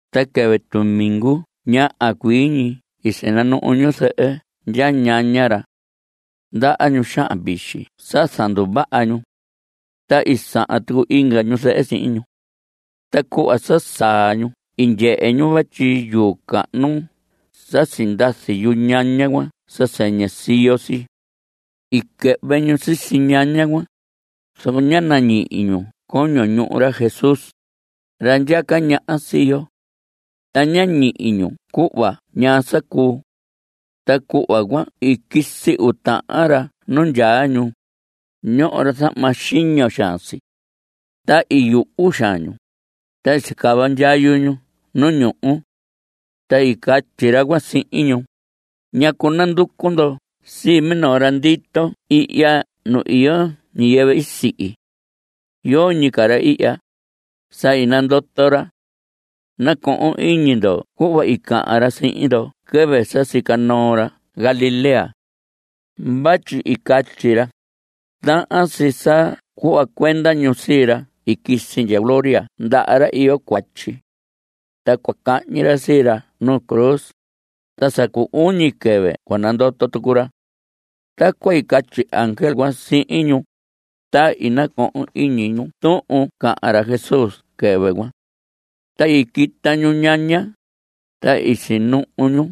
Ta quɨvɨ tumingu ñaha cuii ñi i sinanuhu ñu zɨhɨ ndya ñaña ra. Ndaha ñu xahan vixi sa zanduvaha ñu. Ta i sahan tucu inga ñu zɨhɨ sihin ñu. Ta cuhva sa saa ñu i ndyehe ñu vatyi yuu cahnu sa sindazi yuñaña cuan sa sɨñɨ siyo si. I quɨhvɨ ñu sisi ñaña cuan, zoco ña nañihi ñu coño ñuhu ra Jesús, ra ndyaca ñaha sii yo. Ta ñá ñihi ñu cuhva ñaa sa cuu. Ta cuhva cuan i quisi uu tahan ra nu nandyaa ñu; ñoho ra zahma xiño xaan si. Ta i yuhu xaan ñu. Ta i sicava ndyayu ñu nu ñuhu. Ta i catyi ra cuan sihin ñu: ¿Ñacu nanducu ndo sii minoo ra ndito ihya nu iyo ñiyɨvɨ i sihi? Yoñi ca ra ihya; sa i nandoto ra. Nacohon iñi ndo cuhva i cahan ra sihin ndo quɨvɨ sa sica noo ra Galilea. Vatyi i catyi ra: “Tahan si sa cuhva cuenda ñu sii ra i quisi ndya gloria ndaha ra iyo cuatyi. Ta cua cahñi ra sii ra nuu cruz. Ta sa cu uñi quɨvɨ cua nandoto tucu ra.” (Tacuan i catyi ángel cuan sihin ñu.) Ta i nacohon iñi ñu tuhun i cahan ra Jesús quɨvɨ cuan. Ta i quita ñu nuñaña, ta i sinuhu ñu.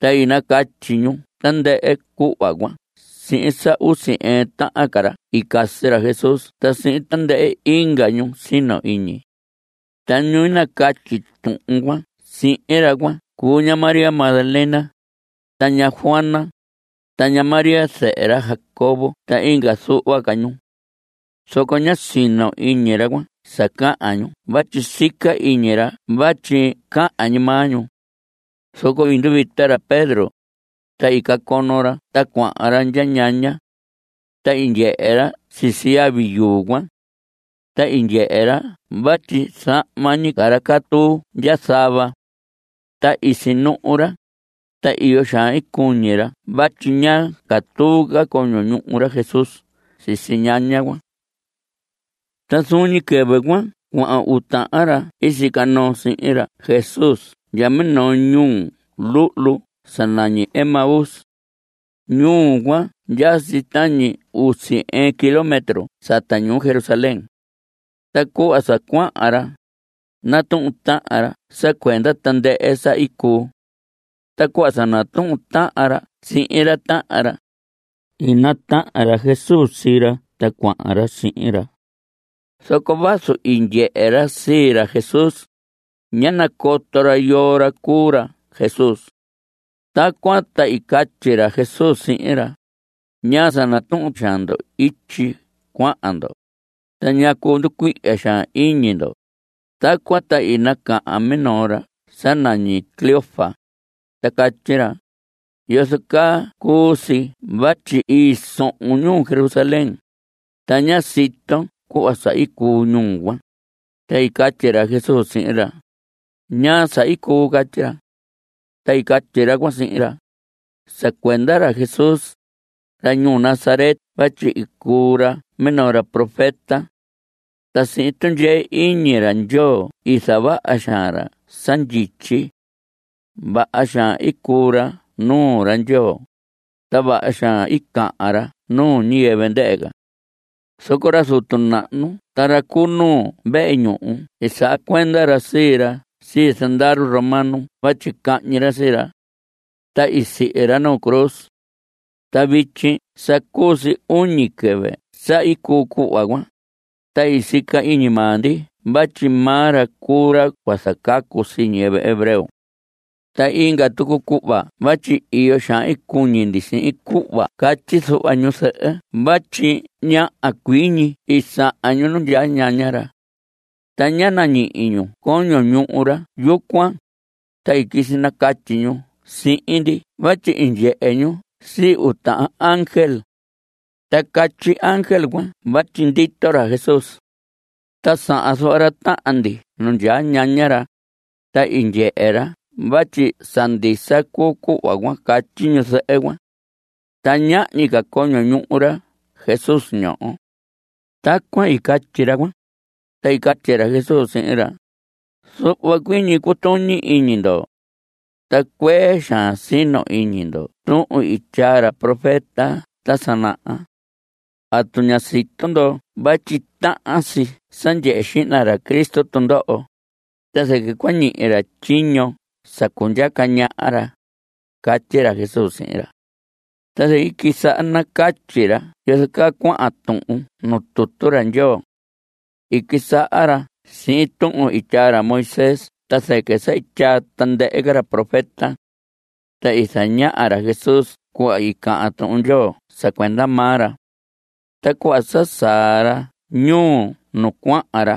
Ta i nacatyi ñu tandɨhɨ cuhva cuan sihin sa usi ɨɨn tahan ca ra i casi ra Jesús ta sihin tandɨhɨ inga ñu sino iñi. Ta ñu nacatyi tuhun cuan sihin ra cuan cuu ña María Magdalena, ta ña Juana, ta ña María zɨhɨ ra Jacobo ta inga zuhva ca ñu. Zoco ñá sino iñi ra cuan sa cahan ñu vatyi sica iñi ra vatyi cahan ñi maa ñu. Zoco i nduvita ra Pedro, ta i cacono ra ta cuahan ra ndya ñaña. Ta i ndyehe ra sisi yavi yuu cuan. Ta i ndyehe ra vatyi zahma ñi ca ra catuu ndya zava. Ta i sinuhu ra. Ta iyo xaan i cuñi ra vatyi ñá catuu ca coño ñuhu ra Jesús sisi ñaña cuan. Ta zuun ñi quɨvɨ cuan cuahan uu tahan ra i sica noo sihin ra Jesús ndya minoo ñuu luhlu sa nañi Emaús. Ñuu cuan ndyaa si tañi usi ɨɨn kilómetro sata ñuu Jerusalén. Ta cuhva sa cuahan ra, natuhun tahan ra sa cuenda tandɨhɨ sa i cuu. Ta cuhva sa natuhun tahan ra sihin ra tahan ra, i natahan ra Jesús sii ra ta cuahan ra sihin ra. Zoco vazu i ndyehe ra sii ra Jesús, ñá nacoto ra yoo ra cuu ra Jesús. Tacuan ta i catyi ra Jesús sihin ra: ¿Ñaa sa natuhun xaan ndo ityi cuahan ndo? Ta ¿ñacu nducuihya xaan iñi ndo? Tacuan ta i nacahan minoo ra sa nañi Cleofas, ta catyi ra: ¿Yozo caa cuu si vatyi i sohon ñuu Jerusalén, ta ña siton cuhva sa i cuu ñuu cuan? Ta i catyi ra Jesús sihin ra: ¿Ñaa sa i cuu? Catyi ra. Ta i catyi ra cuan sihin ra: Sa cuenda ra Jesús, ra ñuu Nazaret vatyi i cuu ra minoo ra profeta. Ta sihin tundyee iñi ra Ndyoo i zavaha xaan ra sa ndyityi. Vaha xaan i cuu ra nuu ra Ndyoo, ta vaha xaan i cahan ra nuu ñiyɨvɨ ndɨhɨ ca. Zoco ra zutu nahnu ta ra cu nuu vehe ñuhu i saha cuenda ra sii ra sii zandaru romano vatyi cahñi ra sii ra. Ta i sihi ra nuu cruz. Ta vityi sa cuu si uñi quɨvɨ sa i cuu cuhva cuan. Ta i sica iñi maa ndi vatyi maa ra cuu ra cua zacacu sii ñiyɨvɨ hebreo. Ta inga tucu cuhva vatyi iyo xaan cuñi ndi sihin cuhva catyi zuhva ñu zɨhɨ vatyi ñaha cuii ñi i sahan ñu nu ndyaa ñaña ra. Ta ñá nañihi ñu coño ñuhu ra yucuan. Ta i quisi nacatyi ñu sihin ndi vatyi i ndyehe ñu sii uu tahan ángel. Ta catyi ángel cuan vatyi ndito ra Jesús. Ta sahan zuhva ra tahan ndi nu ndyaa ñaña ra. Ta i ndyehe ra vatyi sa ndisa cuu cuhva catyi ñu zɨhɨ cuan. Ta ñahñi ca coño ñuhu ra Jesús ñoho. Tacuan i catyi ra cuan. Ta i catyi ra Jesús sihin ra: Zuhva cuii ñi cutuñi iñi ndo. Ta cuee xaan sino iñi ndo tuhun i tyaa ra profeta ta sa naha. ¿Atu ña sito ndo vatyi tahan si sa ndyehe xihna ra Cristo tundoho? ta zɨquɨ cua ñihi ra tyiño sa cundyaca ñaha ra. Catyi ra Jesús sihin ra. Ta zɨquɨ i quisaha nacatyi ra yozo caa cuahan tuhun nu tutu ra Ndyoo. I quisaha ra sihin tuhun i tyaa ra Moisés ta zɨquɨ sa i tyaa tandɨhɨ ra profeta. Ta i zañaha ra Jesús cuhva i cahan Tuhun Ndyoo sa cuenda maa ra. Ta cuhva sa saa ra ñuu nu cuahan ra,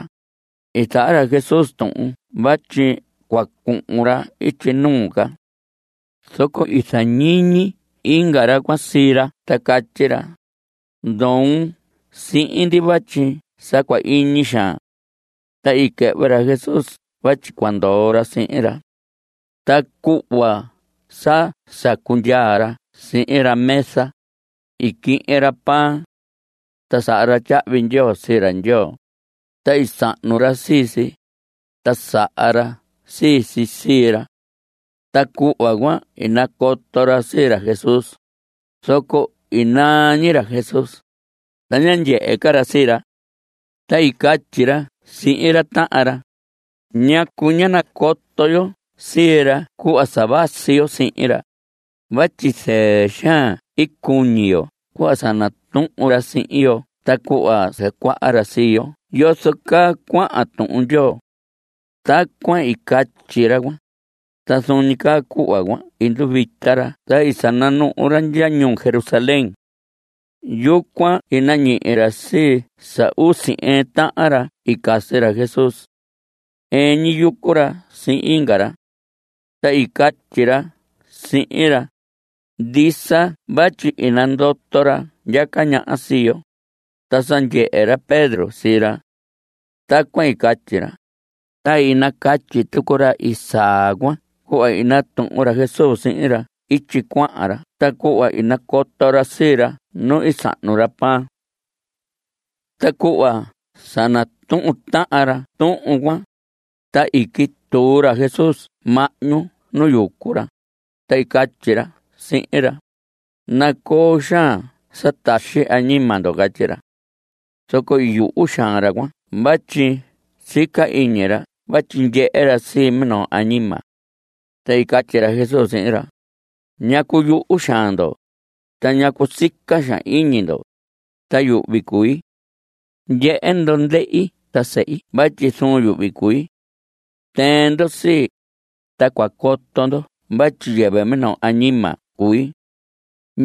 i zaha ra Jesús tuhun vatyi cua cuhun ra ityi nuu ca. Zoco i zañiñi inga ra cuan sii ra ta catyi ra: Ndoon sihin ndi vatyi sa cua iñi xaan. Ta i quɨhvɨ ra Jesús vatyi cua ndoo ra sihin ra. Ta cuhva sa sacundyaa ra sihin ra mesa, i quihin ra pan. Ta saha ra tyahvi ndyoo sii ra Ndyoo. Ta i sahnu ra sii si, ta saha ra sii si sii ra. Ta cuhva cuan i nacoto ra sii ra Jesús, zoco i naa ñi ra Jesús, ta ñá ndyehe ca ra sii ra. Ta i catyi ra sihin ra tahan ra: ¿Ñacu ñá nacoto yo sii ra cuhva sa vasi yo sihin ra? Vatyi zɨɨ xaan i cuñi yo cuhva sa natuhun ra sihin yo ta cuhva zacuaha ra sii yo yozo caa cuahan Tuhun Ndyoo. Tacuan i catyi ra cuan, ta zuun ñi caa cuhva cuan i nduvita ra ta i sananuhu ra ndya ñuu Jerusalén. Yucuan i nañihi ra sii sa usi ɨɨn tahan ca ra i casi ra Jesús. Ɨɨn ñi yucu ra sihin inga ra. Ta i catyi ra sihin ra: Ndisa vatyi i nandoto ra ndyaca ñaha sii yo, ta sa ndyehe ra Pedro sii ra. Tacuan i catyi ra, ta i nacatyi tucu ra i saa cuan cuhva i natuhun ra Jesús sihin ra ityi cuahan ra ta cuhva i nacoto ra sii ra nu i sahnu ra pan. Ta cuhva sa natuhun tahan ra tuhun cuan, ta i quituu ra Jesús mahñu nu yucu ra, ta i catyi ra sihin ra: Nacoo xaan sa taxi añima ndo. Catyi ra. Zoco i yuhu xaan ra cuan vatyi sica iñi ra vatyi ndyehe ra sii minoo añima. Ta i catyi ra Jesús sihin ra: ¿Ñacu yuhu xaan ndo? Ta ¿ñacu sica xaan iñi ndo? ta yuhvi cui. Ndyehe ndo ndehi ta sehi vatyi zuun yuhvi cui. Tɨɨn ndo sii, ta cua coto ndo vatyi yɨvɨ minoo añima cui.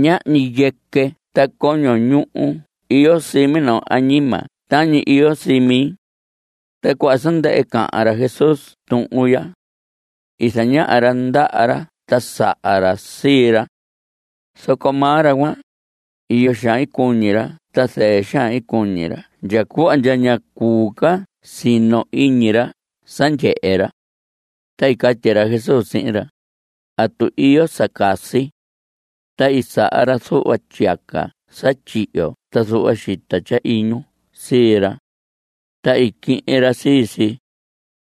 Ñahñi yɨquɨ ta coño ñuhu iyo sii minoo añima tañi iyo sii mi. Ta cuhva sa ndɨhɨ cahan ra Jesús tuhun ya, i zañaha ra ndaha ra ta saha ra sii ra. Zoco maa ra cuan, iyo xaan cuñi ra ta zɨɨ xaan cuñi ra ndya cuhva ndya ña cuu ca sino iñi ra sa ndyehe ra. Ta i catyi ra Jesús sihin ra: ¿Atu iyo sa casi? Ta i saha ra zuhva tyiyaca sa tyihyo ta zuhva xita tyahiñu sii ra. Ta i quihin ra sii si,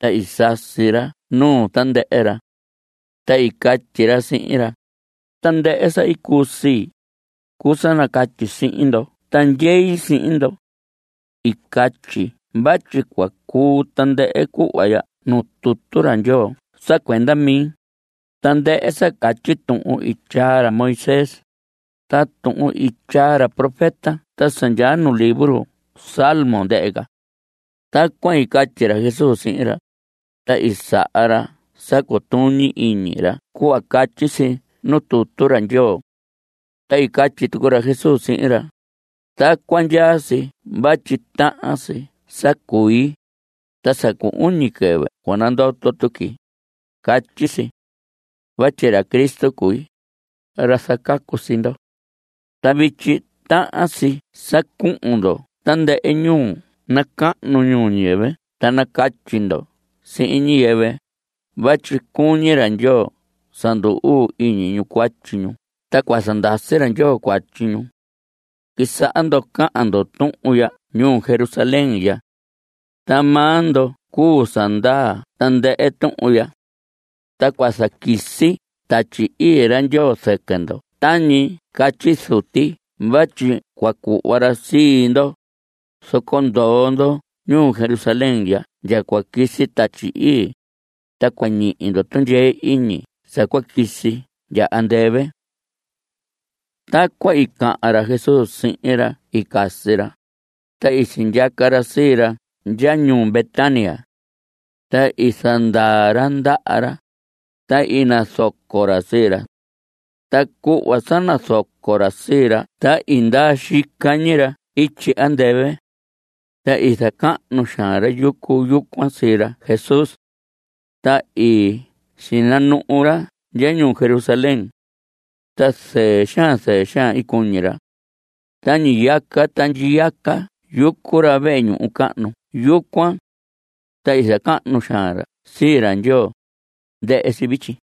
ta i sasi ra nuu tandɨhɨ ra. Ta i catyi ra sihin ra: Tandɨhɨ sa i cuu sii, cuu sa nacatyi sihin ndo ta ndyei sihin ndo. I catyi vatyi cua cuu tandɨhɨ cuhva ndyaa nuu Tutu ra Ndyoo sa cuenda mi, tandɨhɨ sa catyi tuhun i tyaa ra Moisés, ta tuhun i tyaa ra profeta ta sa ndyaa nu libro salmos ndɨhɨ ca. Tacuan i catyi ra Jesús sihin ra, ta i saha ra sa cutuñi iñi ra cuhva catyi si nuu tutu ra Ndyoo. Ta i catyi tucu ra Jesús sihin ra: Tacuan ndyaa si vatyi tahan si sa cui. Ta sa cu uñi quɨvɨ cua nandoto tuqui, catyi si. Vatyi ra Cristo cui, ra zacacu sii ndo. Ta vityi tahan si sa cuhun ndo tandɨhɨ ñuu nacahnu ñuu ñiyɨvɨ ta nacatyi ndo sihin ñiyɨvɨ vatyi cuñi ra Ndyoo sa ndu‑uu iñi ñu cuatyi ñu ta cua zandasi ra Ndyoo cuatyi ñu. Quisaha ndo cahan ndo tuhun ya ñuu Jerusalén ya. Ta maa ndo cuu sa ndaa tandɨhɨ tuhun ya. Ta cua zaquisi Tatyi Ii ra Ndyoo zɨquɨ ndo tañi catyi Zuti vatyi cua cuhva ra sii ndo. Zoco ndoo ndo ñuu Jerusalén ya ndya cua quisi Tatyi Ii, ta cua ñihi ndo tundyee iñi sa cua quisi ndya andɨvɨ. Tacuan i cahan ra Jesús sihin ra i casi ra, ta i sindyaca ra sii ra ndya ñuu Betania. Ta i zandaa ra ndaha ra, ta i nazoco ra sii ra. Ta cuhva sa nazoco ra sii ra ta i ndaa xica ñi ra ityi andɨvɨ. Ta i zacahnu xaan ra yucu yucuan sii ra Jesús. Ta i sinanuhu ra ndya ñuu Jerusalén. Ta zɨɨ xaan zɨɨ xaan i cuñi ra. Ta ñiyaca ta ndyiyaca yucu ra vehe ñuhu cahnu yucuan. Ta zacahnu xaan ra sii ra Ndyoo. Ndɨhɨ si vityi.